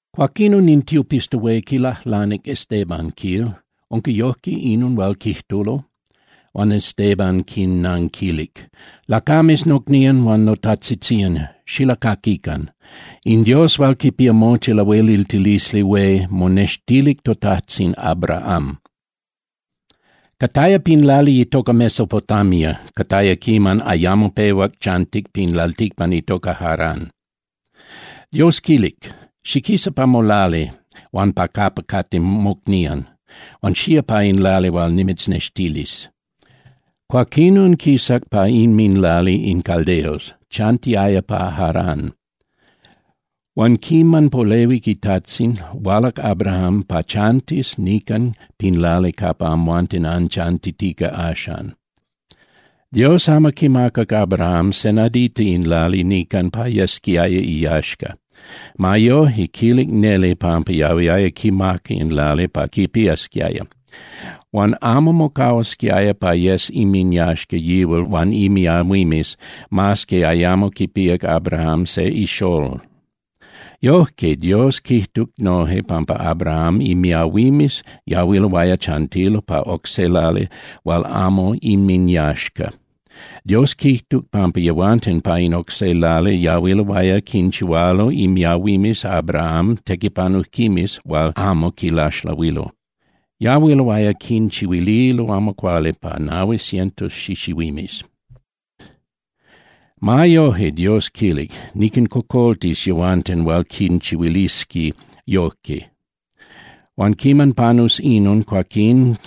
Cuaquinon in tiopista hué quilajlanic Estéban, quil: —¿Unca yojque inon hual quijtulo? Huan Estéban quinnanquilic: —Lacames nocnían huan notajtzitzían, xilacaquican. In Dios hual quipía mochi lahueliltilisli hué monextilic totajtzin Abraham. Cataya pin lali itoca Mesopotamia, cataya quiman ayamo pehuac chantic pin lalticpan itoca Harán. Dios quilic: “Xiquisa pa molali huan pa capa cate mocnían, huan xía pa in lali hual nimitznextilis.” Cuaquinon, quisac pa inminlali in caldeos, chantiaya pa Harán. Huan quiman polehuic itajtzin, hualac Abraham pa chantis nican pin lali capa amhuanten anchantitica axan. Dios amo quimacac Abraham se nadita in lali nican pa yesquiaya iyaxca. Ma yoje, quilic neli pampa yahuiaya quimaca in lali pa quipiasquiaya. Huan amo mocahuasquiaya pa yes inminyaxca yihual huan imiahuimes, mas que ayamo quipíac Abrahám se ixolol. Yojque Dios quijtuc noje pampa Abraham imiahuimes yahuiloaya chantilo pa oc se lali hual amo inminyaxca. Dios quijtuc pampa yehuanten pa in oc se lali yahuiloaya quinchihualo imiahuimes Abrahám tequipanujquimes hual amo quilaxlahuilo. Yahuiloaya quinchihuililo amo cuali pa nahui cientos xixihuimes. Ma yoje, Dios quilic: “Niquincocoltis yehuanten hual quinchihuilisqui yojque. Huan quiman panus inon, cuaquín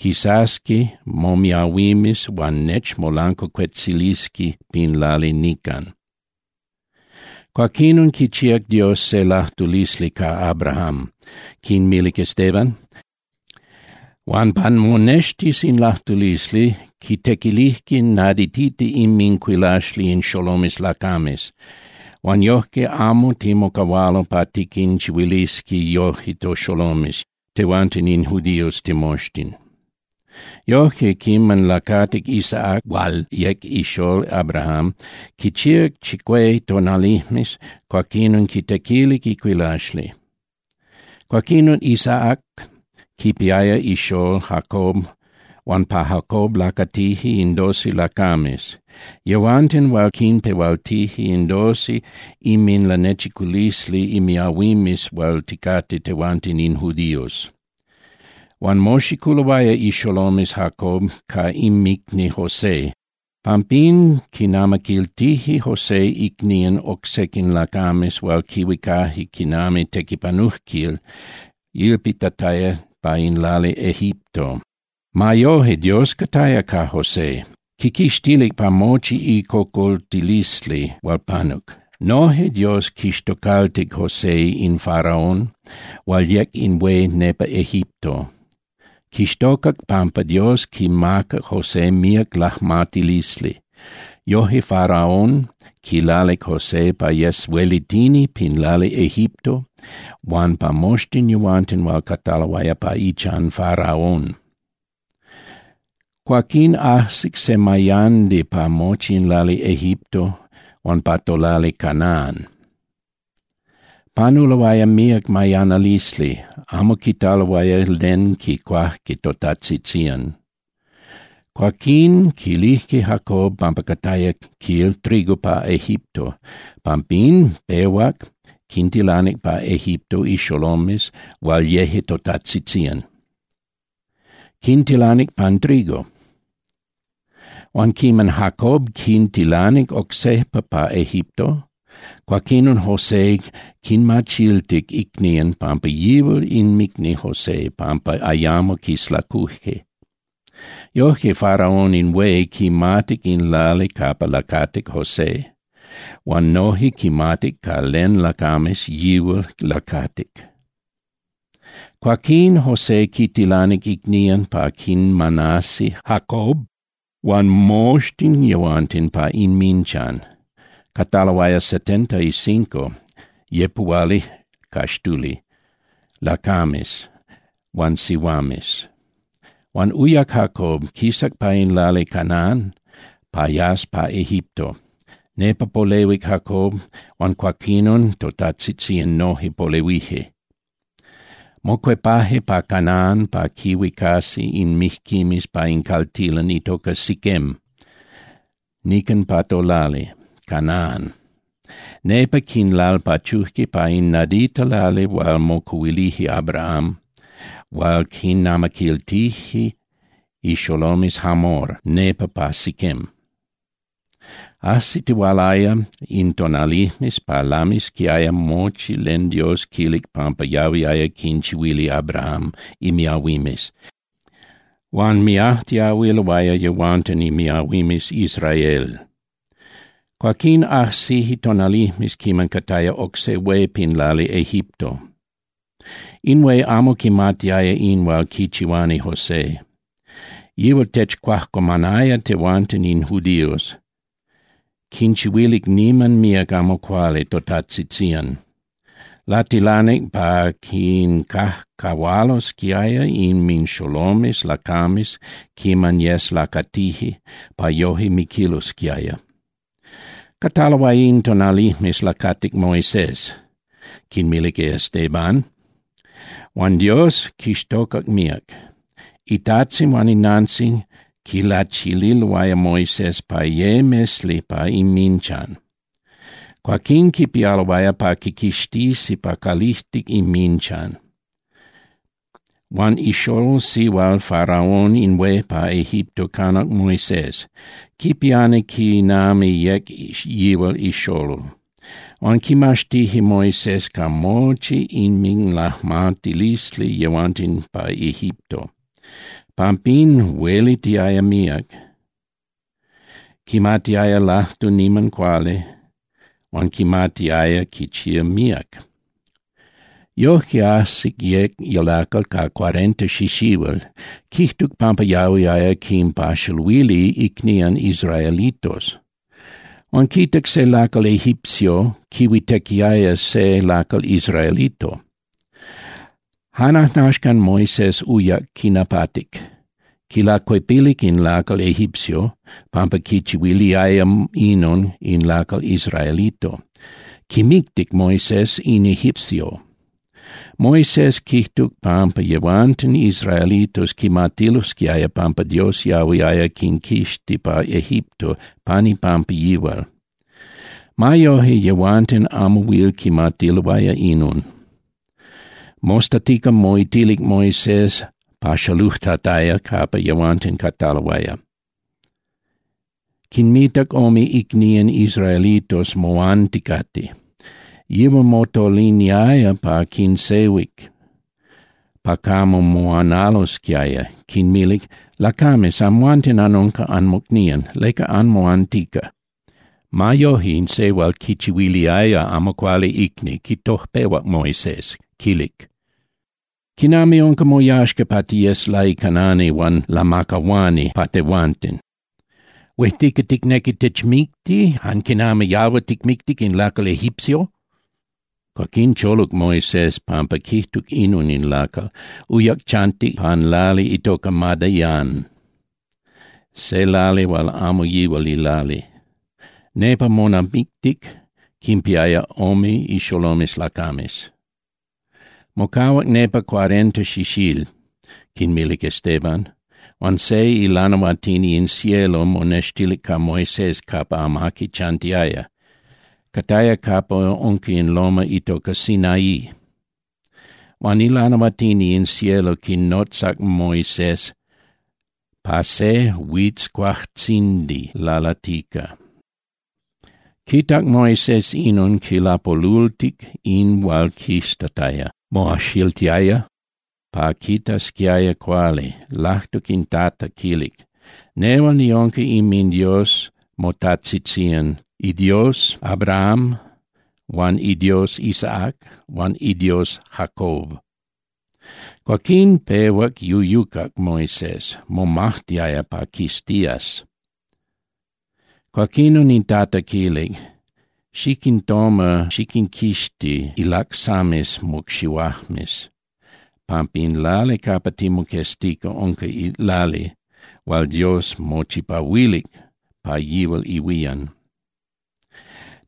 quisasqui momiahuimes huan nechmolancuacuetzilisqui pin lali nican.” ’Cuaquinon quichíac Dios se lajtulisli ca Abraham, —quinmilic Estéban—, huan pa monextis in lajtulisli, quintequilijque naditita inmincuilaxli in xolomes lacames, huan yojque amo timocahualo pa tiquinchihuilisi yoje toxolomes tehuanten in judíos timoxtin. Yojque quiman lacatic Isaac hual yec ixolol Abrahám quichíac chicué tonalijmes, cuaquinon quitequilic icuilaxli. Cuaquinon Isaac quipiaya ixolol Jacob huan pa Jacob lacatije in doce lacames, yehuanten hual quinpehualtije in doce inminlanechiculisli imiahuimes hual ticate tehuanten in judíos. Huan moxiculoaya ixolomes Jacob ca inmicni José, pampín quinamaquiltije José icnían oc sequin lacames hual quihuicaje quinami tequipanujquil ilpitataya pa in lali Egipto. Ma yoje, Dios cataya ca José. Quiquixtilic pa mochi icocoltilisli hual panuc. Noje Dios quixtocaltic José in Faraón hual yec in hué nepa Egipto. Quixtocac pampa Dios quimacac José míac lajmatilisli. Yoje Faraón quilalic José pa yes huelitini pin lali Egipto huan pa moxtin yehuanten hual cataloaya pa ichan Faraón. ’Cuaquín ajsic se mayandi pa mochi in lali Egipto huan pa tolali Canaan. Panuloaya míac mayanalisli, amo quitaloaya len quicuajque totajtzitzían. Cuaquín quilijque Jacob pampa cataya, quil, trigo pa Egipto, pampín pehuac quintilanic pa Egipto ixolomes hual yeje totajtzitzían, quintilanic pan trigo. Huan quiman Jacob quintilanic oc sejpa pa Egipto, cuaquinon José quinmachiltic icnían pampa yihual inmicni José pampa ayamo quislacuje. Yojque, Faraón in hué quimatic in lali capa lacatic José huan noje quimatic ca len lacames yihual lacatic. Cuaquín José quintilanic icnían pa quinmanasi Jacob huan moxtin yehuanten pa inminchan. Cataloaya setenta y cinco (yepuhualicaxtuli) lacames huan sihuames. Huan uyac Jacob, quisac pa in lali Canaan pa yas pa Egipto. Nepa polehuic Jacob huan cuaquinon totajtzitzían noje polehuije. Mocuepaje pa Canaan pa quinhuicasi in mijquimes pa in caltilan itoca Siquem nican pa tolali Canaan, nepa quinlalpachuje pa in nadita lali hual mocuhuilic Abraham hual quinamaquiltijque ixolomes Hamor nepa pa Siquem. Ajsitihualaya in tonalijmes pa lamisquiaya mochía len Dios quilic pampa yahuiaya quinchihuili Abraham imiahuimes, huan miajtiahuiloaya yehuanten imiahuimes Israel. Cuaquín ajsije tonalijmes quiman cataya oc se hué pin lali Egipto. In hué amo quimatiaya in hual quichihuani José. Yihual techcuajcuamanaya tehuanten in judíos, quinchihuilic niman míac amo cuali totajtzitzían. Latilanic pa quincajcahualosquiaya inminxolomes lacames quiman yes lacatije pa yoje miquilosquiaya. ’Cataloaya in tonalijmes lacatic Moisés —quinmilic Estéban—, huan Dios quixtocac míac. Itajtzin huan inantzin quilachililoaya Moisés pa ye mesli pa inminchan. Cuaquín quipialoaya pa quiquixtisi pa calijtic inminchan. Huan ixolol sihual Faraón in hué pa Egipto canac Moisés, quipiani quinami yec yihual ixolol. Huan quimaxtije Moisés ca mochi inminlajmatilisli yehuanten pa Egipto. Pampín huelitiaya míac, quimatiaya lajtu niman cuali huan quimatiaya quichía míac. ’Yojque, ajsic yec lacal ca cuarenta xixihuil, quijtuc pampa yahuiaya quinpaxaluili icnían israelitos. Huan quitac se lacal egipcio quihuitequiaya se lacal israelito. Jan ajnaxcan Moisés uyac quinapatic. Quilacuepilic in lacal egipcio pampa quichihuiliaya inon in lacal israelito, quimictic Moisés in egipcio. Moisés quijtuc pampa yehuanten israelitos quimatilosquiaya pampa Dios yahuiaya quinquixti pa Egipto pan ipampa yihual. Ma yoje, yehuanten amo huil quimatiloaya inon. Mostatica moitilic Moisés paxalujtataya capa yehuanten cataloaya. Quinmitac ome icnían israelitos moanticate. Yihual motoliniaya pa quinsehuic pa camo moanalosquiaya, quinmilic: “Lacames, amhuanten anunca anmocnían. ¿Leca anmoantica?” Ma yoje, in se hual quichihuiliaya amo cuali icni quitojpehuac Moisés, quilic: “¿Quinami unca moyaxca pa tiyes laicanani huan lamacahuani pa tehuanten? ¿Huejtica ticnequi tichmicti jan quinami yalhua ticmictic in lacal egipcio?” Cuaquín choluc Moisés pampa quijtuc inon in lacal. Uyac chantic pan lali itoca Madián, se lali hual amo yihual ilali. Nepa monamictic, quinpiaya ome ixolomes lacames. ’Mocahuac nepa cuarenta xixíl —quinmilic Estéban— huan se ilanahuatini in cielo monextic ca Moisés capa amaqui chantiaya, cataya capa unca in loma itoca Sinaí. Huan ilanahuatini in cielo quinotzac Moisés pa se huitzcuajtzindi lalatica. Quitac Moisés inon, quilapolultic in hual quiztataya. Moajxiltiaya pa quitasquiaya cuali, lajtuc in Tata, quilic: “Nehual niunca inminDios motajtzitzían, iDios Abraham huan iDios Isaac huan iDios Jacob.” Cuaquín pehuac yuyucac Moisés, momajtiaya pa quiztías. Cuaquinon in Tata quilic: “Xiquintoma xiquinquixti ilacsames mocxihuajmes, pampa in lali capa timoqueztica unca lali hual Dios mochipahuilic pa yihual ihuían.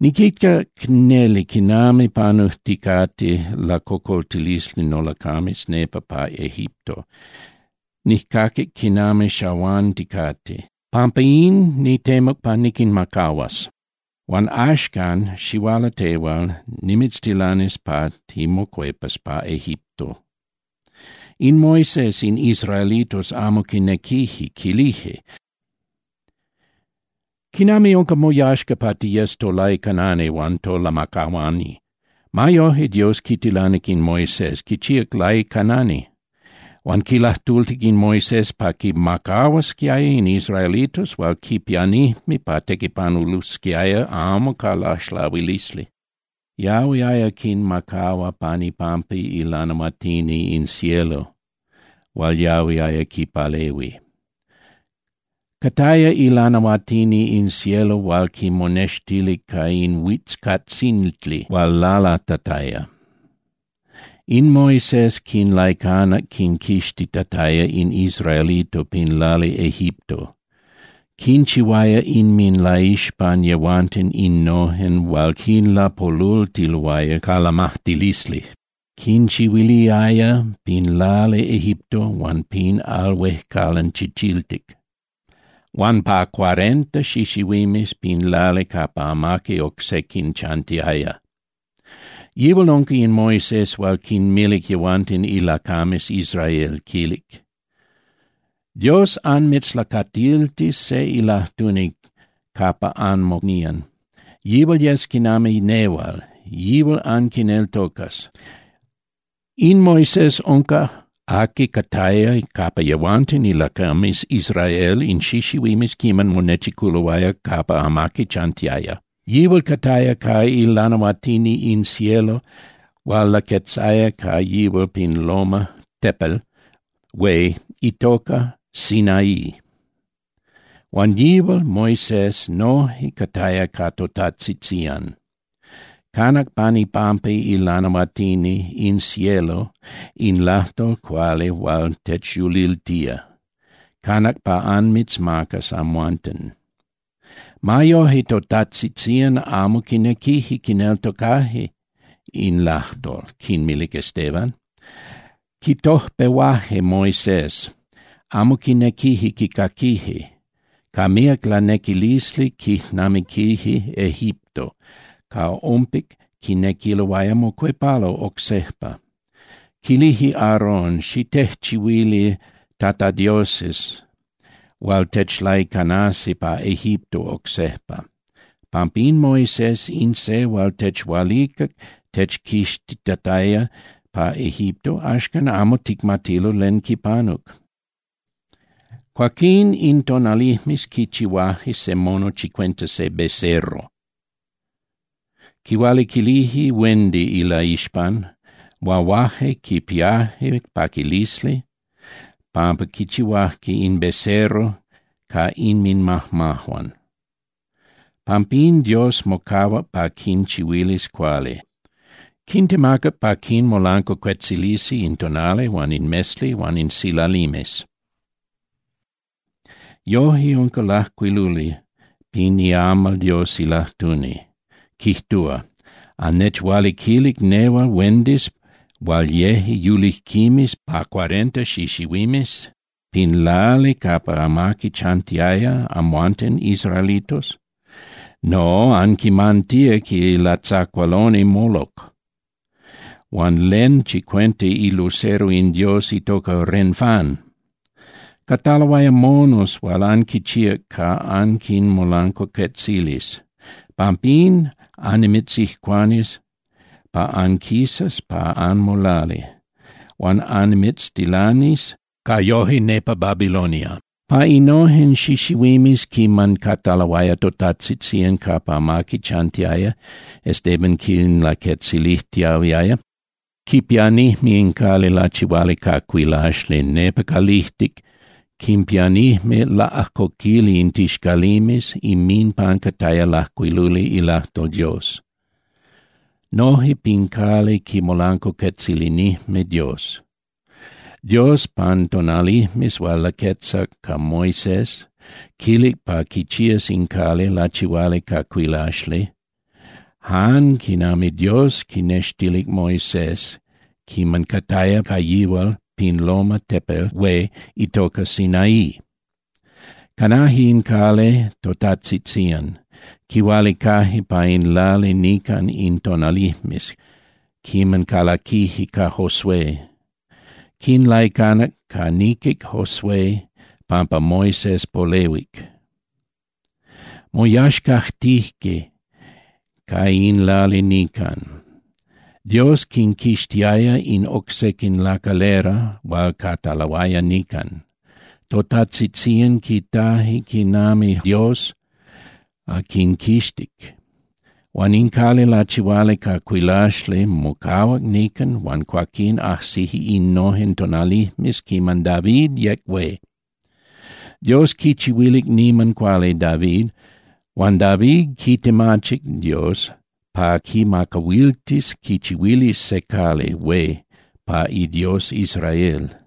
Niquitac neli quinami panujticate lacocoltilisli nolacames nepa pa Egipto, nijcaquic quinami xahuanticate. Pampa in, nitemuc pa niquinmacahuas. Huan axcan, xihuala tehual, nimitztilanis pa timocuepas pa Egipto.” ’In Moisés in israelitos amo quinequije, quilije: “¿Quinami unca moyaxca pa tiyes tolaicanani huan tolamacahuani?” Ma yoje Dios quitilanic in Moisés, quichíac laicanani. Huan quilajtultic in Moisés pa quimacahuasquiaya in israelitos hual quipianijme pa tequipanulosquiaya amo ca laxlahuilisli. Yahuiaya quinmacahua pan ipampa ilanahuatini in cielo hual yahuiaya quipalehui. Cataya ilanahuatini in cielo hual quimonextilic ca in huizcuajtzindi hual lalatataya. In Moisés quinlaicanac quinquixtitataya in israelitos pin lali Egipto. Quinchihuaya inminlaixpan yehuanten innojen hual quinlapolultiloaya ca lamajtilisli. Quinchihuiliaya pin lali Egipto huan pin Al Huejcalan Chichiltic, huan pa cuarenta xixihuimes pin lali capa amaqui oc sequin chantiaya. Yihual unca in Moisés hual quinmilic yehuanten ilacames Israel, quil: “Dios anmitzlacatiltilis se ilajtuni capa anmocnían. Yihual yes quinami nehual, yihual anquineltocas.” In Moisés unca aqui cataya capa yehuanten ilacames Israel in xixihuimes quiman monechiculoaya capa amaqui chantiaya. Yihual cataya ca ilanahuatini in cielo hual laquetzaya ca yihual pin loma (tepel) hué itoca Sinaí. Huan yihual Moisés noje cataya ca totajtzitzían. Canac pan ipampa ilanahuatini in cielo in lajtol cuali hual techyuliltía, canac pa anmitzmacas amhuanten. ’Ma yoje, totajtzitzían amo quinequije quineltocaje in lajtol —quinmilic Estéban—, quitojpehuaje Moisés, amo quinequije quicaquije. Ca míac lanequilisli quijnamiquije Egipto, ca ompic quinequiloaya mocuepalo oc sejpa. Quilije Aaron; “Xitejchihuili tatadioses hual techlaicanasi pa Egipto oc sejpa, pampa in Moisés, in se hual techhualicac techquixtitataya pa Egipto, axcan amo ticmatilo len quipanuc.” Cuaquín in tonalijmes quichihuaje se mono chicuenta se becerro. Quihualiquilije huendi ilaixpan, huahuaje quipiaje paquilisli pampa quichihuajque in becerro ca inminmajmajuan. Pampín Dios mocahuac pa quinchihuilis cuali. Quintemacac pa quinmolancuacuetzilisi in tonali huan in mesli huan in silalimes. Yojque unca lajcuiluli pin iamal Dios ilajtuni, quijtua: ¿Annechhualiquilic nehual huendis hual yeje yulijquimes pa cuarenta xixihuimes pin lali capa amaqui chantiaya, amhuanten israelitos? No, anquimantíac ilatzacualoni Moloc huan len chicuenta ilucero in dios itoca Renfán. Cataloaya monos hual anquinchíac pa anquinmolancuacuetzilis. Pampín annimitzijcuanis pa anquisas pa anmolali huan annimitztilanis ca yoje nepa Babilonia. ’Pa innojen xixihuimes quiman cataloaya totajtzitzían capa amaqui chantiaya —Estéban quinlaquetzilijtiahuiaya—, quipianijme in cali lachihuali ca cuilaxli, nepa calijtic quinpianijme laꞌajcoquili in tixcalimes, inminpan cataya lajcuiluli ilajtol Dios. Noje pin cali quimolancuacuetzilinijme Dios. Dios, pan tonalijmes hual laquetzac ca Moisés, quilic pa quichías in cali lachihuali ca cuilaxli jan quinami Dios quinextilic Moisés quiman cataya ca yihual pin loma (tepel) hué itoca Sinaí. Canaje in cali totajtzitzían, quihualicaje pa in lali nican in tonalijmes quiman calaquije ca Josué. Quinlaicanac ca niquic Josué pampa Moisés polehuic. Moyaxcajtije ca in lali nican. Dios quinquixtiaya in oc sequin lacalera hual cataloaya nican. Totajtzitzían quitaje quinami Dios quinquixtic. Huan in cali lachihuali ca cuilaxli mocahuac nican huan cuaquín ajsije innojen tonalijmes quiman David yec hué. Dios quichihuilic niman cuali David, huan David quitemachic Dios pa quimacahuiltis quichihuilis se cali hué pa iDios Israel.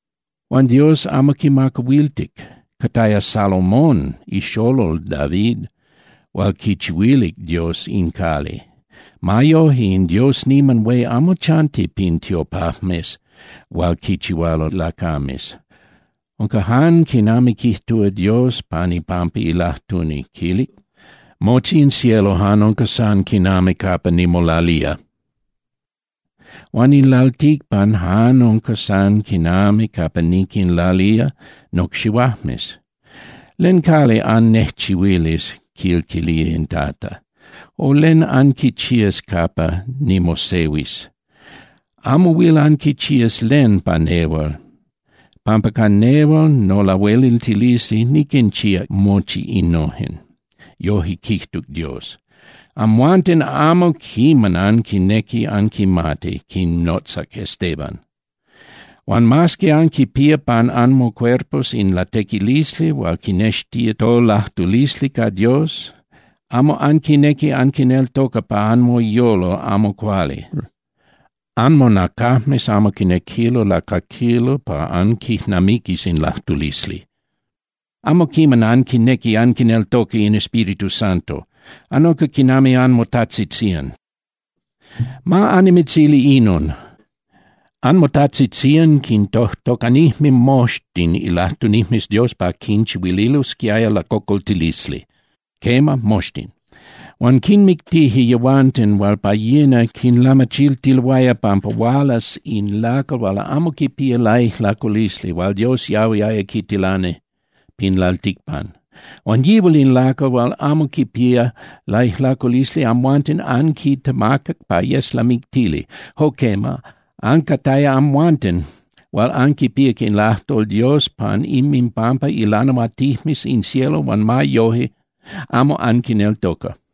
Huan Dios amo quimacahuiltic. Cataya Salomón ixolol David hual quichihuilic Dios in cali. Ma yoje, in Dios niman hué amo chanti pin tiopajmes hual quinchihualo lacames. Unca jan quinami quijtúa Dios pan ipampa ilajtuni, quilic: Mochi in cielo jan unca san quinami capa nimolalía, huan in lalticpan jan unca san quinami capa niquinlalía nocxihuajmes. ¿Len cali annejchihuilis? quil quilía in Tata, o ¿len anquichías capa nimosehuis? Amo huil anquichías len pa nehual pampa ca nehual nolahueliltilisli niquinchíac mochi innojen. Yojque quijtuc Dios. ¡Amhuanten amo quiman anquinequi anquimati —quinnotzac Estéban—, huan mas que anquipía pan anmocuerpos in latequilisli hual quinextía tolajtulisli ca Dios, amo anquinequi anquineltoca pa anmoyolo amo cuali! Anmonacajmes amo quinequilo lacaquilo pa anquijnamiquis in lajtulisli. Amo quiman anquinequi anquineltoca in Espíritu Santo, anunca quinami anmotajtzitzían. Ma annimitzili inon. Anmotajtzitzían quintojtocanijme moxtin ilajtunijmes Dios pa quinchihuililosquiaya lacocoltilisli, quema, moxtin. Huan quinmictije yehuanten hual pa yina quinlamachiltiloaya pampa hualas in lacal hual amo quipía laijlaculisli hual Dios yahuiaya quitilani pin lalticpan. Huan yihual in lacal hual amo quipía laijlaculisli amhuanten anquitemacac pa yes lamictili. Jo quema, ancataya amhuanten hual anquipíac in ilajtol Dios pan inminpampa ilanahuatinijmes in cielo huan ma yoje amo anquineltoca.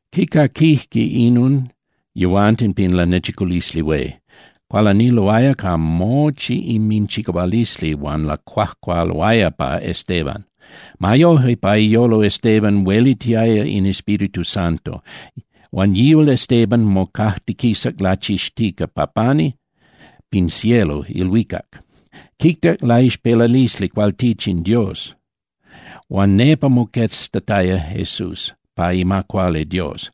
Quicaquijque inon yehuanten pin Lanechiculisli Hué, cualaniloaya ca mochi inminchicahualisli huan lacuajcualoaya pa Estéban. Ma yoje, pa iyolo Estéban huelitiaya in Espíritu Santo, huan yihual Estéban mocajtiquisac lachixtica pa pani pin cielo (ilhuicac). Quitac ilaixpelalisli cualtichin Dios, huan nepa moqueztataya Jesús pa ima cuali Dios.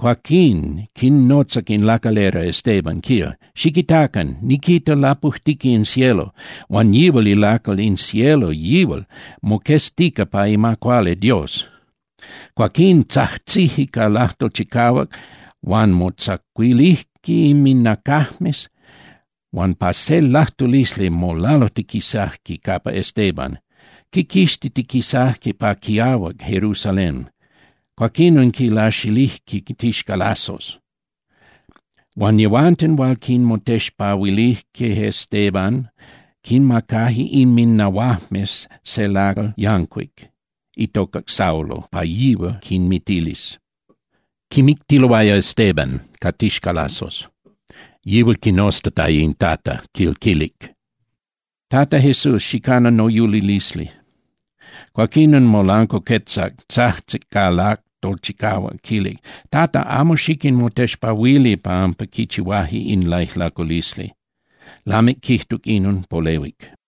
Cuaquín quinnotzac in lacalera Estéban, quil: —¡Xiquitacan, niquita lapujtica in cielo, huan yihual ilacal in cielo, yihual moqueztica pa ima cuali Dios! Cuaquín tzajtzijque ca lajtol chicahuac huan motzacuilijque inminnacajmes huan ca se lajtulisli molalujtiquisajque capa Estéban. Quiquixtitiquisajque pa quiahuac Jerusalén, cuaquinon quilaxilijque tixcalazos. Huan yehuanten hual quimotexpahuilijque Estéban quinmacajque inminnahuajmes se lacal yancuic itoca Saulo pa yihual quinmitilis. Quimictiloaya Estéban ca tixcalazos, yihual quinoztataya in Tata, quil quilic: —Tata Jesús, xicana noyulilisli. Cuaquinon molancuacuetzac, tzajtzic ca lajtol chicahuac, quijtuc: —Tata, amo xiquinmotexpahuili pampa quichihuaje in laijlaculisli. Lamic quijtuc inon, polehuic.